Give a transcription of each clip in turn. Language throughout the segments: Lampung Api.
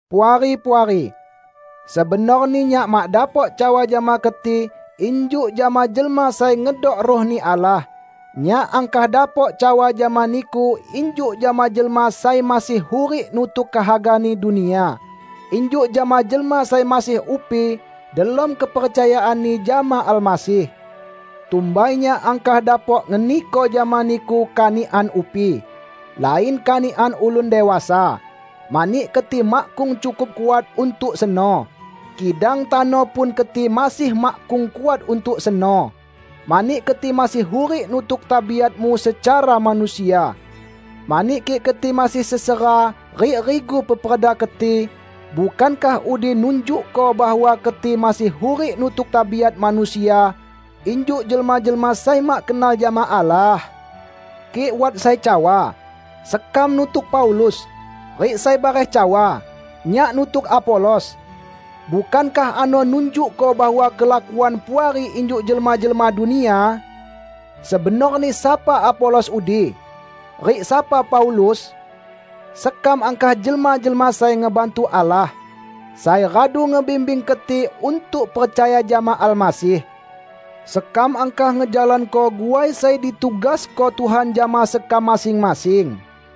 Puari-puari, sebenorni nyak mak dapok cawa jama keti injuk jama jelma sai ngedok Ruh-Ni Allah. Nyak angkah dapok cawa jama niku injuk jama jelma sai masih hurik nutuk kehagani dunia; injuk jama jelma sai masih upi delom kepercayaanni jama Almasih. Tumbai nyak angkah dapok ngeniko jama niku kanikan upi, lain kanikan ulun dewasa; mani keti makkung cukup kuat untuk seno. Kidang tano pun keti masih makkung kuat untuk seno, mani keti masih hurik nutuk tabiatmu secara manusia. Mani kik keti masih sesera rik rigu peperda keti, bukankah udi nunjukko bahwa keti masih hurik nutuk tabiat manusia, injuk jelma-jelma sai mak kenal jama Allah? Kik wat sai cawa, "Sekam nutuk Paulus," rik sai bareh cawa, "Nyak nutuk Apolos," bukankah ano nunjukko bahwa kelakuan Puari injuk jelma-jelma dunia? Sebenorni sapa Apolos udi? Rik sapa Paulus? Sekam angkah jelma-jelma sai ngebantu Allah, sai radu ngebimbing keti untuk percaya jama Almasih. Sekam angkah ngejalanko guai sai ditugasko Tuhan jama sekam masing-masing.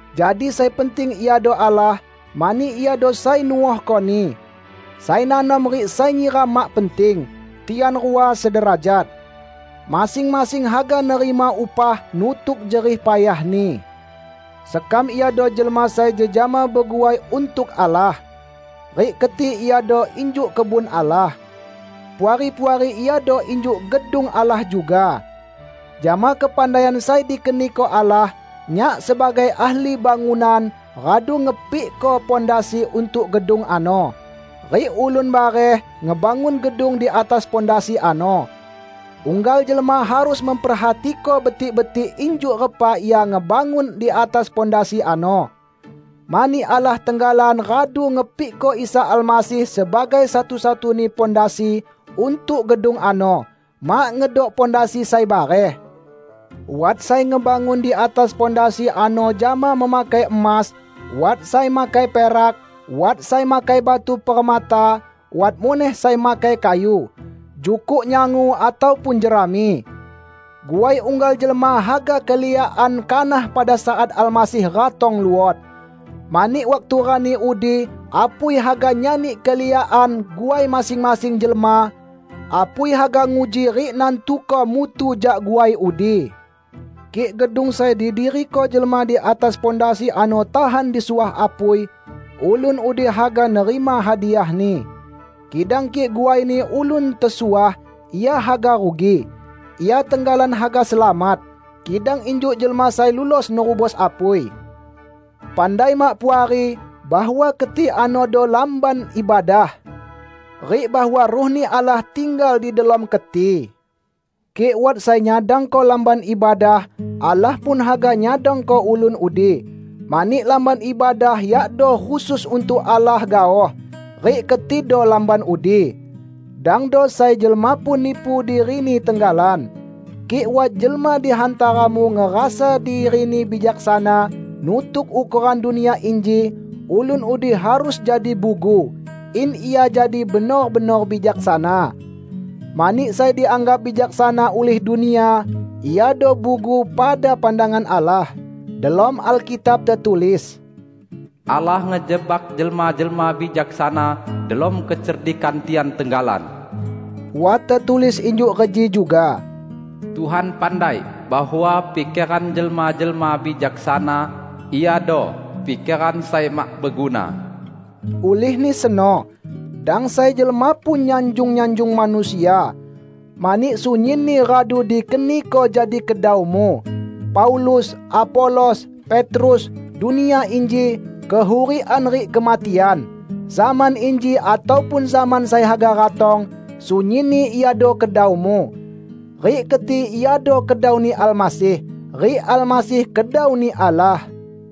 Jadi sai penting iado Allah, mani Iado sai nuohkoni. Sai nanom rik sai nyiram mak penting; tian rua sederajat. Masing-masing haga nerima upah nutuk jerih payahni. Sekam iado jelma sai jejama beguai untuk Allah; rik keti iado injuk kebun Allah. Puari-puari iado injuk gedung Allah juga. Jama kepandaian sai dikeniko Allah, nyak sebagai ahli bangunan radu ngepikko pondasi untuk gedung ano, rik ulun bareh ngebangun gedung di atas pondasi ano. Unggal jelma harus memperhatiko betik-betik injuk repa ia ngebangun di atas pondasi ano. Mani Allah tenggalan radu ngepikko Isa Almasih sebagai satu-satuni pondasi untuk gedung ano; mak ngedok pondasi sai bareh. Wat sai ngebangun di atas pondasi ano jama memakai emas, wat sai makai perak, wat sai makai batu permata, wat muneh sai makai kayu, jukuk nyangu ataupun jerami. Guai unggal jelma haga keliakan kanah pada saat Almasih ratong luot. Mani waktu rani udi apui haga nyani keliakan guai masing-masing jelma. Apui haga nguji rik nantuko mutu jak guai udi. Kik gedung sai didiriko jelma di atas pondasi ano tahan disuah apui, ulun udi haga nerima hadiahni. Kidang kik guaini ulun tesuah, ia haga rugi; ia tenggalan haga selamat, kidang injuk jelma sai lulos nerubos apui. Pandai mak Puari bahwa keti anodo Lamban Ibadah? Rik bahwa Ruh-Ni Allah tinggal di delom keti? Kik wat sai nyadangko Lamban Ibadah, Allah pun haga nyadangko ulun udi. Mani Lamban Ibadah yakdo khusus untuk Allah gaoh, rik ketido lamban udi. Dangdo sai jelma pun nipu dirini tenggalan. Kik wat jelma di hantaramu ngerasa dirini bijaksana nutuk ukoran dunia inji, ulun udi harus jadi bugu, in ia jadi benor-benor bijaksana. Mani sai dianggap bijaksana ulih dunia iado bugu pada pandangan Allah. Delom Alkitab tetulis, "Allah ngejebak jelma-jelma bijaksana delom kecerdikan tian tenggalan." Wat tetulis injuk reji juga, "Tuhan pandai bahwa pikeran jelma-jelma bijaksana iado pikeran sai mak beguna." Ulihni seno, dang sai jelma pun nyanjung-nyanjung manusia, mani sunyinni radu dikeniko jadi kedaumu: Paulus, Apolos, Petrus, dunia inji, kehurikan rik kematian, zaman inji ataupun zaman sai haga ratong, sunyinni iado kedaumu. Rik keti iado kedau-Ni Almasih, rik Almasih kedau-Ni Allah.